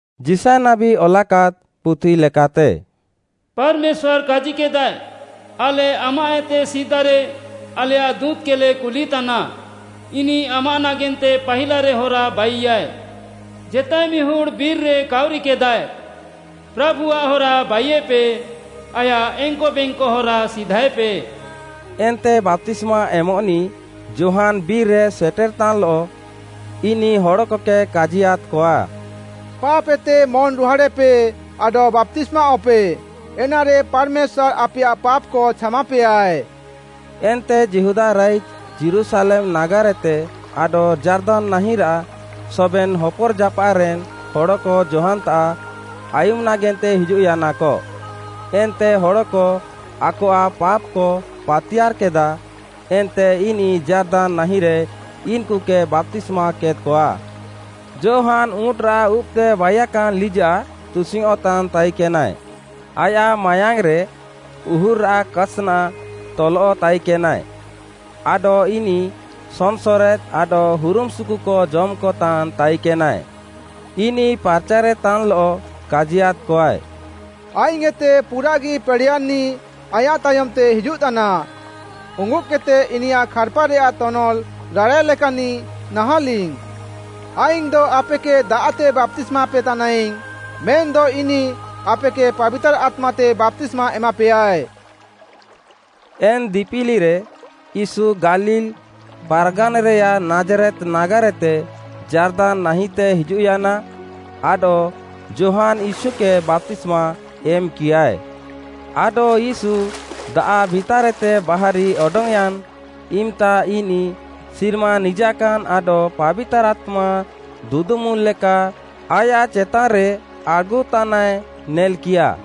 ଯିଶାୟ ନାବୀ ଅଲାକାଦ୍‌ ପୁଥି ଲେକାତେ, “ପାର୍‌ମେଶ୍ୱାର୍‌ କାଜିକେଦାଏ, ‘ଆଲେ ଆମାଃଏତେ ସିଦାରେ ଆଲେୟାଃ ଦୁଁତ୍‌କେଲେ କୁଲିତାନା ଇନିଃ ଆମାଃ ନାଗେନ୍ତେ ପାହିଲାରେ ହରା ବାଇୟାଏ।’ ଜେତାଏ ମିହୁଡ଼୍‌ ବିର୍‌ରେ କାଉରିକେଦାଏ, ‘ପ୍ରାଭୁଆଃ ହରା ବାଇୟେପେ, ଆୟାଃ ଏଙ୍କବେଙ୍କ ହରା ସିଧାଏପେ।’” ଏନ୍ତେ ବାପ୍ତିସ୍ମା ଏମଃନିଃ ଯୋହାନ୍‌ ବିର୍‌ରେ ସେଟେର୍‌ତାନ୍‌ଲଃ, ଇନିଃ ହଡ଼କକେ କାଜିୟାଦ୍‌କଆ, “ପାପ୍‌ଏତେ ମନ୍‌ରୁହାଡ଼େପେ ଆଡଃ ବାପ୍ତିସ୍ମାଅଃପେ, ଏନାରେ ପାର୍‌ମେଶ୍ୱାର୍‌ ଆପେୟାଃ ପାପ୍‌କ ଛାମାପେୟାଏ।” ଏନ୍ତେ ଯିହୁଦା ରାଇଜ୍‌, ଯୀରୁଶାଲେମ୍‌ ନାଗାର୍‌ଏତେ ଆଡଃ ଯାର୍ଦାନ୍‌ ନାହିଁରାଃ ସବେନ୍‌ ହପର୍‌ଜାପାଃରେନ୍‌ ହଡ଼କ ଯୋହାନ୍‌ତାଃ ଆୟୁମ୍‌ ନାଗେନ୍ତେ ହିଜୁଃୟାନାକ। ଏନ୍ତେ ହଡ଼କ ଆକଆଃ ପାପ୍‌କ ପାତିୟାର୍‌କେଦା ଏନ୍ତେ ଇନିଃ ଯାର୍ଦାନ୍‌ ନାହିଁରେ ଇନ୍‌କୁକେ ବାପ୍ତିସ୍ମାକେଦ୍‌କଆ। ଯୋହାନ୍‌ ଉଁଟ୍‌ରାଃ ଉବ୍‌ତେ ବାଇୟାକାନ୍ ଲିଜାଃ ତୁସିଙ୍ଗ୍‌ଅଃଁତାନ୍‌ ତାଇକେନାଏ, ଆୟାଃ ମାୟାଙ୍ଗ୍‌ରେ ଉହୁର୍‌ରାଃ କାସ୍‌ନା ତଲଃ ତାଇକେନାଏ ଆଡଃ ଇନିଃ ସନ୍‌ସରେଦ୍‌ ଆଡଃ ହୁରୁମ୍‌ସୁୁକୁ ଜମ୍‌କତାନ୍‌ ତାଇକେନାଏ। ଇନିଃ ପାର୍‌ଚାରେତାନ୍‌ଲଃ କାଜିୟାଦ୍‌କଆଏ, “ଆଇଙ୍ଗ୍‌ଏତେ ପୁରାଃଗି ପେଡ଼େୟାନ୍‌ନିଃ ଆଇଁୟାଃ ତାୟମ୍‌ତେ ହିଜୁଃତାନା, ଉଙ୍ଗୁଦ୍‌କେଦ୍‌ତେ ଇନିୟାଃ ଖାର୍‌ପାରେୟାଃ ତନଲ୍‌ ରାଡ଼ାଏ ଲେକାନ୍‌ନିଃ ନାହାଁଲିଙ୍ଗ୍‌। ଆଇଙ୍ଗ୍‌ଦ ଆପେକେ ଦାଆଃତେ ବାପ୍ତିସ୍ମାପେ ତାନାଇଙ୍ଗ୍‌, ମେନ୍‌ଦ ଇନିଃ ଆପେକେ ପାବିତାର୍‌ ଆତ୍ମାତେ ବାପ୍ତିସ୍ମା ଏମାପେୟାଏ।” ଏନ୍‌ ଦିପିଲିରେ ୟୀଶୁ ଗାଲିଲ୍‌ ପାର୍‌ଗାନ୍‌ରେୟାଃ ନାଜ୍‌ରେତ୍‌ ନାଗାର୍‌ଏତେ ଯାର୍ଦାନ୍‌ ନାହିଁତେ ହିଜୁଃୟାନା, ଆଡଃ ଯୋହାନ୍‌ ୟୀଶୁକେ ବାପ୍ତିସ୍ମା ଏମ୍‌କିୟାଏ। ଆଡଃ ୟୀଶୁ ଦାଆଃ ଭିତାର୍‌ଏତେ ବାହାରି ଅଡଙ୍ଗ୍‌ୟାନ୍‌ ଇମ୍‌ତା ଇନିଃ ସିର୍ମା ନିଜାକାନ୍‌ ଆଡଃ ପାବିତାର୍‌ ଆତ୍ମା ଦୁଦୁମୁଲ୍‌ ଲେକା ଆୟାଃ ଚେତାନ୍‌ରେ ଆଡ଼୍‌ଗୁତାନାଏ ନେଲ୍‌କିୟା।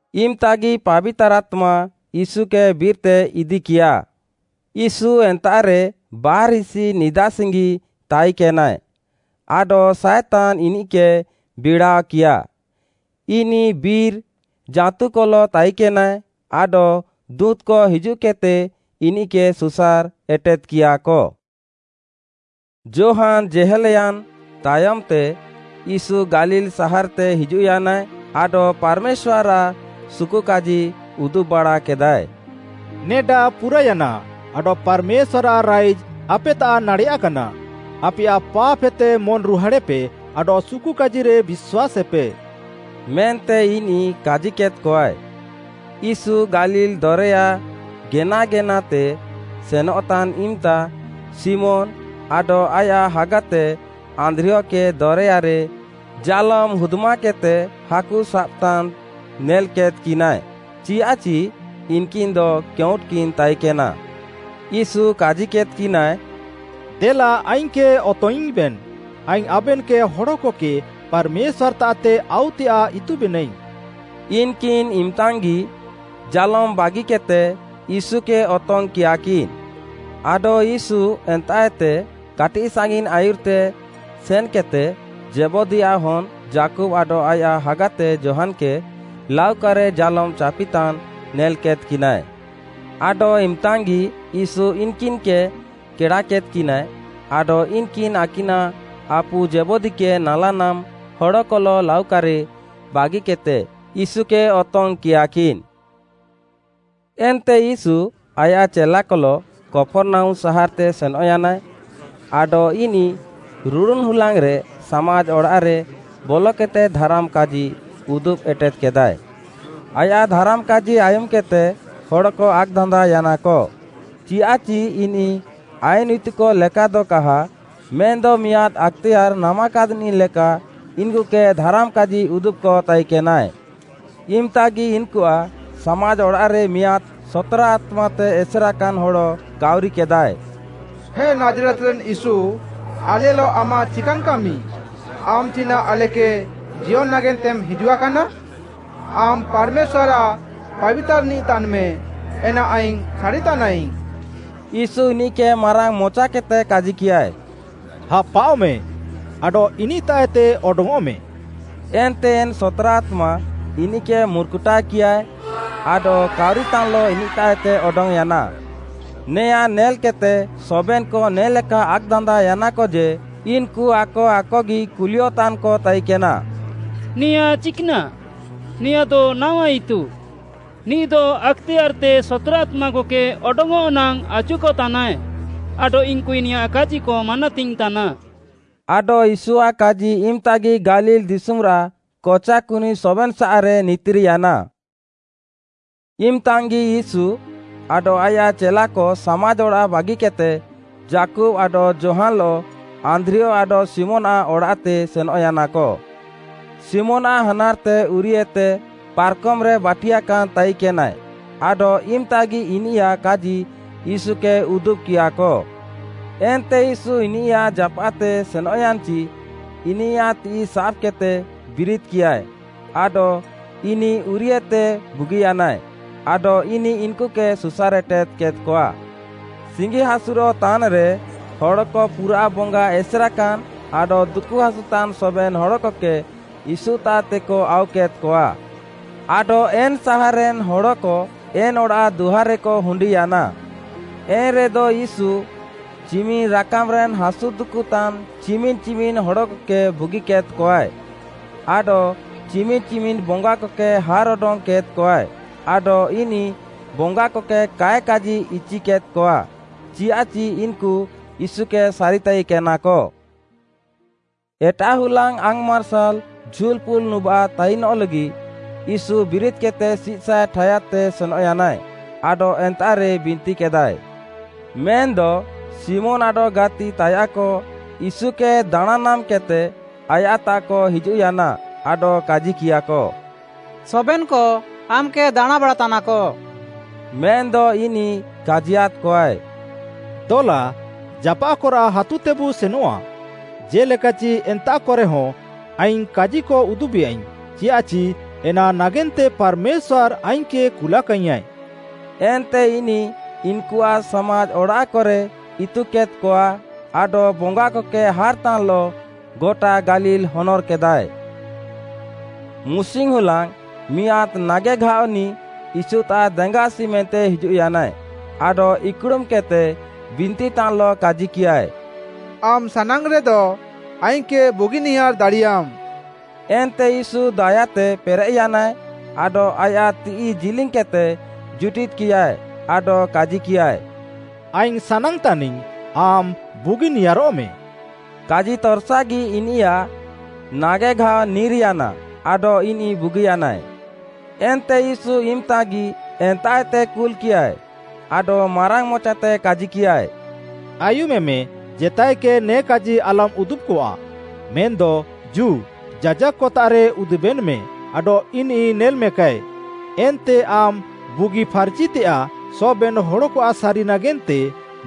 ଇମ୍‌ତାଗି ପାବିତାର୍‌ ଆତ୍ମା ୟୀଶୁକେ ବିର୍‌ତେ ଇଦିକିୟା। ୟୀଶୁ ଏନ୍ତାଃରେ ବାର୍‌ହିସି ନିଦାସିଙ୍ଗି ତାଇକେନାଏ, ଆଡଃ ସାଏତାନ୍‌ ଇନିଃକେ ବିଡ଼ାଅକିୟା। ଇନିଃ ବିର୍‌ ଜାଁତୁକଲଃ ତାଇକେନାଏ ଆଡଃ ଦୁଁତ୍‌କ ହିଜୁଃକେଦ୍‌ତେ ଇନିଃକେ ସୁସାର୍‌ ଏଟେଦ୍‌କିୟାକ। ଯୋହାନ୍‌ ଜେହେଲ୍‌ୟାନ୍‌ ତାୟମ୍‌ତେ, ୟୀଶୁ ଗାଲିଲ୍‌ ସାହାର୍‌ତେ ହିଜୁଃୟାନାଏ ଆଡଃ ପାର୍‌ମେଶ୍ୱାର୍‌ରାଃ ସୁକୁକାଜି ଉଦୁବ୍‌ବାଡ଼ାକେଦାଏ। “ନେଡା ପୁରାୟାନା, ଆଡଃ ପାର୍‌ମେଶ୍ୱାର୍‌ଆଃ ରାଇଜ୍‌ ଆପେତାଃ ନାଡ଼େୟାକାନା! ଆପେୟାଃ ପାପ୍‌ହେତେ ମନ୍‌ରୁହାଡ଼େପେ ଆଡଃ ସୁକୁକାଜିରେ ବିଶ୍ୱାସେପେ” ମେନ୍ତେ ଇନିଃ କାଜିକେଦ୍‌କଆଏ। ୟୀଶୁ ଗାଲିଲ୍‌ ଦରେୟା ଗେନାଗେନାତେ ସେନଃତାନ୍‌ ଇମ୍‌ତା ଶିମୋନ୍‌ ଆଡଃ ଆୟାଃ ହାଗାତେ ଆନ୍ଦ୍ରିୟକେ ଦରେୟାରେ ଜାଲୋମ୍‌ ହୁଦ୍‌ମାକେଦ୍‌ତେ ହାକୁ ସାବ୍‌ତାନ୍‌ ନେଲ୍‌କେଦ୍‌କିନାଏ, ଚିୟାଃଚି ଇନ୍‌କିନ୍‌ଦ କେଉଁଟ୍‌କିନ୍ ତାଇକେନା। ୟୀଶୁ କାଜିକେଦ୍‌କିନାଏ, “ଦେଲା ଆଇଙ୍ଗ୍‌କେ ଅତଙ୍ଗ୍‌ଇଙ୍ଗ୍‌ବେନ୍‌, ଆଇଙ୍ଗ୍‌ ଆବେନ୍‌କେ ହଡ଼କକେ ପାର୍‌ମେଶ୍ୱାର୍‌ତାଃତେ ଆଉତେୟାଃ ଇତୁବେନାଇଙ୍ଗ୍‌।” ଇନ୍‌କିନ୍‌ ଇମ୍‌ତାଙ୍ଗ୍‌ଗି ଜାଲୋମ୍‌ ବାଗିକେଦ୍‌ତେ ୟୀଶୁକେ ଅତଙ୍ଗ୍‌କିୟାକିନ୍‌। ଆଡଃ ୟୀଶୁ ଏନ୍ତାଃଏତେ କାଟିଃସାଙ୍ଗିନ୍‌ ଆୟୁର୍‌ତେ ସେନ୍‌କେଦ୍‌ତେ ଜେବଦୀୟାଃ ହନ୍‌ ଯାକୁବ୍‌ ଆଡଃ ଆୟାଃ ହାଗାତେ ଯୋହାନ୍‌କେ ଲାଉକାରେ ଜାଲୋମ୍‌ ଚାପିତାନ୍‌ ନେଲ୍‌କେଦ୍‌କିନାଏ। ଆଡଃ ଇମ୍‌ତାଙ୍ଗ୍‌ଗି ୟୀଶୁ ଇନ୍‌କିନ୍‌କେ କେଡ଼ାକେଦ୍‌କିନାଏ, ଆଡଃ ଇନ୍‌କିନ୍‌ ଆକିନାଃ ଆପୁ ଜେବଦୀକେ ନାଲାନାମ୍‌ ହଡ଼କଲଃ ଲାଉକାରେ ବାଗିକେଦ୍‌ତେ ୟୀଶୁକେ ଅତଙ୍ଗ୍‌କିୟାକିନ୍‌। ଏନ୍ତେ ୟୀଶୁ ଆୟାଃ ଚେଲାକଲଃ କପର୍‌ନାହୁମ୍‌ ସାହାର୍‌ତେ ସେନଃୟାନାଏ, ଆଡଃ ଇନିଃ ରୁଡ଼ୁନ୍‌ ହୁଲାଙ୍ଗ୍‌ରେ ସାମାଜ୍‌ ଅଡ଼ାଃରେ ବଲକେଦ୍‌ତେ ଧାରାମ୍‌ କାଜି ଉଦୁବ୍‌ ଏଟେଦ୍‌କେଦାଏ। ଆୟାଃ ଧାରାମ୍‌ କାଜି ଆୟୁମ୍‌କେଦ୍‌ତେ ହଡ଼କ ଆକ୍‌ଦାନ୍ଦାଅୟାନାକ, ଚିୟାଃଚି ଇନିଃ ଆଇନ୍‌ ଇତୁକ ଲେକାଦ କାହା, ମେନ୍‌ଦ ମିଆଁଦ୍‌ ଆକ୍‌ତେୟାର୍‌ ନାମାକାଦ୍‌ନିଃଲେକା ଇନ୍‌କୁକେ ଧାରାମ୍‌ କାଜି ଉଦୁବ୍‌କ ତାଇକେନାଏ। ଇମ୍‌ତାଗି ଇନ୍‌କୁଆଃ ସାମାଜ୍‌ ଅଡ଼ାଃରେ ମିଆଁଦ୍‌ ସତ୍‌ରା ଆତ୍ମାତେ ଏସେରାକାନ୍ ହଡ଼ କାଉରିକେଦାଏ, “ହେ ନାଜ୍‌ରେତ୍‌ରେନ୍‌ ୟୀଶୁ, ଆଲେଲଃ ଆମାଃ ଚିକାନ୍‌ କାମି? ଆମ୍‌ ଚିନାଃ ଆଲେକେ ଜିୟନ୍‌ ନାଗେନ୍ତେମ୍ ହିଜୁଆକାନା? ଆମ୍‌ ପାର୍‌ମେଶ୍ୱାର୍‌ଆଃ ପାବିତାର୍‌ନିଃ ତାନ୍‌ମେ, ଏନା ଆଇଙ୍ଗ୍‌ ସାରିତାନାଇଙ୍ଗ୍‌।” ୟୀଶୁ ଇନିଃକେ ମାରାଙ୍ଗ୍‌ମଚାକେଦ୍‌ତେ କାଜିକିୟାଏ, “ହାପାଅଃମେଁ, ଆଡଃ ଇନିଃତାଃଏତେ ଅଡଙ୍ଗ୍‌ଅଃମେ।” ଏନ୍ତେ ଏନ୍‌ ସତ୍‌ରା ଆତ୍ମା ଇନିଃକେ ମୁର୍‌କୁଟାଅକିୟାଏ ଆଡଃ କାଉରିତାନ୍‌ଲଃ ଇନିଃତାଃଏତେ ଅଡଙ୍ଗ୍‌ୟାନା। ନେୟାଁ ନେଲ୍‌କେଦ୍‌ତେ ସବେନ୍‌କ ନେ'ଲେକା ଆକ୍‌ଦାନ୍ଦାଅୟାନାକ ଯେ, ଇନ୍‌କୁ ଆକ ଆକଗି କୁଲିୟଃତାନ୍‌କ ତାଇନ୍‌କେନା “ନେୟାଁ ଚିକ୍‌ନାଃ? ନେଆଁଦ ନାୱା ଇତୁ! ନିଃଦ ଆକ୍‌ତେୟାର୍‌ତେ ସତ୍‌ରା ଆତ୍ମାକକେ ଅଡଙ୍ଗ୍‌ଅଃ ନାଙ୍ଗ୍‌ ଆଚୁକତାନାଏ ଆଡଃ ଇନ୍‌କୁ ଇନିୟାଃ କାଜିକ ମାନାତିଙ୍ଗ୍‌ତାନା।” ଆଡଃ ୟୀଶୁଆଃ କାଜି ଇମ୍‌ତାଗି ଗାଲିଲ୍‌ ଦିଶୁମ୍‌ରାଃ କଚାକୁନି ସବେନ୍‌ସାଃରେ ନିତିର୍‌ୟାନା। ଇମ୍‌ତାଙ୍ଗ୍‌ଗି ୟୀଶୁ ଆଡଃ ଆୟାଃ ଚେଲାକ ସାମାଜ୍‌ ଅଡ଼ାଃ ବାଗିକେଦ୍‌ତେ, ଯାକୁବ୍‌ ଆଡଃ ଯୋହାନ୍‌ଲଃ, ଆନ୍ଦ୍ରିୟ ଆଡଃ ଶିମୋନ୍‌ଆଃ ଅଡ଼ାଃତେ ସେନଃୟାନାକ। ଶିମୋନ୍‌ଆଃ ହାନାର୍‌ତେ ଉରିୟୁତେ ପାର୍‌କମ୍‌ରେ ବାଟିୟାକାନ୍‌ ତାଇକେନାଏ, ଆଡଃ ଇମ୍‌ତାଗି ଇନିୟାଃ କାଜି ୟୀଶୁକେ ଉଦୁବ୍‌କିୟାଃକ। ଏନ୍ତେ ୟୀଶୁ ଇନିୟାଃ ଜାପାଃତେ ସେନ୍‌ୟାନ୍‌ଚିଃ ଇନିୟାଃ ତିଃଇ ସାବ୍‌କେଦ୍‌ତେ ବିରିଦ୍‌କିୟାଏ ଆଡଃ ଇନିଃ ଉରିୟୁଏତେ ବୁଗିୟାନା, ଆଡଃ ଇନିଃ ଇନ୍‌କୁକେ ସୁସାର୍‌ ଏଟେଦ୍‌କେଦ୍‌କଆ। ସିଙ୍ଗିହାସୁରଃ ତାନ୍‌ରେ ହଡ଼କ ପୁରାଃ ବଙ୍ଗା ଏସେର୍‌କାନ୍‌ ଆଡଃ ଦୁକୁହାସୁତାନ୍‌ ସବେନ୍‌ ହଡ଼କକେ ୟୀଶୁତାଃତେକ ଆଉକେଦ୍‌କଆ। ଆଡଃ ଏନ୍‌ ସାହାର୍‌ରେନ୍‌ ହଡ଼କ ଏନ୍‌ ଅଡ଼ାଃ ଦୁଆର୍‌ରେକ ହୁଣ୍ଡିୟାନା। ଏନ୍‌ରେଦ ୟୀଶୁ ଚିମିନ୍‌ ରାକାମ୍‌ରେନ୍‌ ହାସୁ ଦୁକୁତାନ୍‌ ଚିମିନ୍‌ ଚିମିନ୍‌ ହଡ଼କକେ ବୁଗିକେଦ୍‌କଆଏ, ଆଡଃ ଚିମିନ୍‌ ଚିମିନ୍‌ ବଙ୍ଗାକକେ ହାର୍‌ଅଡଙ୍ଗ୍‌ କେଦ୍‌କଆଏ, ଆଡଃ ଇନିଃ ବଙ୍ଗାକକେ କାଏ କାଜି ଇଚିକେଦ୍‌କଆ, ଚିୟାଃଚି ଇନ୍‌କୁ ୟୀଶୁକେ ସାରିତାଇକେନାକ। ଏଟାଃ ହୁଲାଙ୍ଗ୍‌ ଆଙ୍ଗ୍‌ମାର୍ସାଲ୍‌ ଝୁଲ୍‌ପୁଲ୍‌ନୁବାଃ ତାଇନ୍‌ଲଃଗି ୟୀଶୁ ବିରିଦ୍‌କେଦ୍‌ତେ ସିଃସଏଃ ଠାୟାଦ୍‌ତେ ସେନଃୟାନାଏ ଆଡଃ ଏନ୍ତାଃରେ ବିନ୍ତିକେଦାଏ। ମେନ୍‌ଦ, ଶିମୋନ୍‌ ଆଡଃ ଗାତି ତାୟାଃକ ୟୀଶୁକେ ଦାଣାଁଁ ନାମ୍‌କେଦ୍‌ତେ, ଆୟାଃତାଃକ ହିଜୁଃୟାନା ଆଡଃ କାଜିକିୟାଃକ, “ସବେନ୍‌କ ଆମ୍‌କେ ଦାଣାଁଁବାଡ଼ାତାନାକ।” ମେନ୍‌ଦ ଇନିଃ କାଜିୟାଦ୍‌କଆଏ, “ଦଲା, ଜାପାଃକରାଃ ହାତୁତେବୁ ସେନଆଃ, ଜେ'ଲେକାଚି ଏନ୍ତାଃକରେହଁ ଆଇଙ୍ଗ୍‌ କାଜିକ ଉଦୁବେୟାଇଙ୍ଗ୍‌, ଚିୟାଃଚି ଏନା ନାଗେନ୍ତେ ପାର୍‌ମେଶ୍ୱାର୍‌ ଆଇଙ୍ଗ୍‌କେ କୁଲାକାଇଙ୍ଗ୍‌ୟାଁ।” ଏନ୍ତେ ଇନିଃ ଇନ୍‌କୁଆଃ ସାମାଜ୍‌ ଅଡ଼ାଃକରେ ଇତୁକେଦ୍‌କଆ ଆଡଃ ବଙ୍ଗାକକେ ହାର୍‌ତାନ୍‌ଲଃ ଗଟା ଗାଲିଲ୍‌ ହନର୍‌କେଦାଏ। ମୁସିଙ୍ଗ୍‌ ହୁଲାଙ୍ଗ୍‌ ମିଆଁଦ୍‌ ନାଗେଘାଅନିଃ ୟୀଶୁତାଃ ଦେଙ୍ଗାଆସି ମେନ୍ତେ ହିଜୁଃୟାନାଏ, ଆଡଃ ଇକ୍‌ଡ଼ୁମ୍‌କେଦ୍‌ତେ ବିନ୍ତିତାନ୍‌ଲଃ କାଜିକିୟାଏ, “ଆମ୍‌ ସାନାଙ୍ଗ୍‌ରେଦ ଆଇଙ୍ଗ୍‌କେ ବୁଗିନିୟାର୍‌ ଦାଡ଼ିୟାମ୍‌।” ଏନ୍ତେ ୟୀଶୁ ଦାୟାତେ ପେରେଃୟାନାଏ ଆଡଃ ଆୟାଃ ତିଃଇ ଜିଲିଙ୍ଗ୍‌କେଦ୍‌ତେ ଜୁଟିଦ୍‌କିୟାଏ ଆଡଃ କାଜିକିୟାଏ, “ଆଇଙ୍ଗ୍‌ ସାନାଙ୍ଗ୍‌ତାନିଙ୍ଗ୍‌ ଆମ୍‌ ବୁଗିନିୟାରଃମେ।” କାଜିତର୍‌ସାଗି ଇନିୟାଃ ନାଗେଘାଅ ନିର୍‌ୟାନା ଆଡଃ ଇନିଃ ବୁଗିୟାନାଏ। ଏନ୍ତେ ୟୀଶୁ ଇମ୍‌ତାଗି ଏନ୍ତାଃଏତେ କୁଲ୍‌କିୟାଏ, ଆଡଃ ମାରାଙ୍ଗ୍‌ମଚାତେ କାଜିକିୟାଏ, “ଆୟୁମେମେ, ଜେତାଏକେ ନେ କାଜି ଆଲମ୍‌ ଉଦୁବ୍‌କଆଃ, ମେନ୍‌ଦ, ଜୁ, ଯାଜାକ୍‌ତାଃରେ ଉଦୁବେନ୍‌ମେ ଆଡଃ ଇନିଃ ନେଲ୍‌ମେକାଏ, ଏନ୍ତେ ଆମ୍‌ ବୁଗିଫାର୍‌ଚିୟଃତେୟାଃ ସବେନ୍‌ ହଡ଼କଆଃ ସାରିନାଗେନ୍ତେ,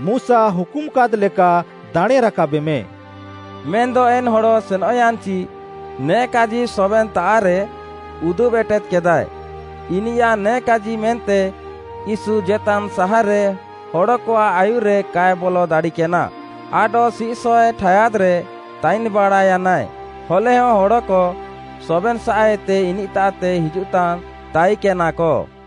ମୁଶା ହୁକୁମାକାଦ୍‌ଲେକା ଦାଣେଁରାକାବେମେ।” ମେନ୍‌ଦ ଏନ୍‌ ହଡ଼ ସେନଃୟାନ୍‌ଚି ନେ କାଜି ସବେନ୍‌ତାଃରେ ଉଦୁବ୍‌ ଏଟେଦ୍‌କେଦାଏ, ଇନିୟାଃ ନେ କାଜି ମେନ୍ତେ ୟୀଶୁ ଜେତାନ୍‌ ସାହାର୍‌ରେ ହଡ଼କଆଃ ଆୟୁର୍‌ରେ କାଏ ବଲ ଦାଡ଼ିକେନା, ଆଡଃ ସିଃସଏଃ ଠାୟାଦ୍‌ରେ ତାଇନ୍‌ବାଡ଼ାୟାନାଏ, ହଲେହଁ ହଡ଼କ ସବେନ୍‌ସାଃଏତେ ଇନିଃତାଃତେ ହିଜୁଃତାନ୍‌ ତାଇକେନାକ।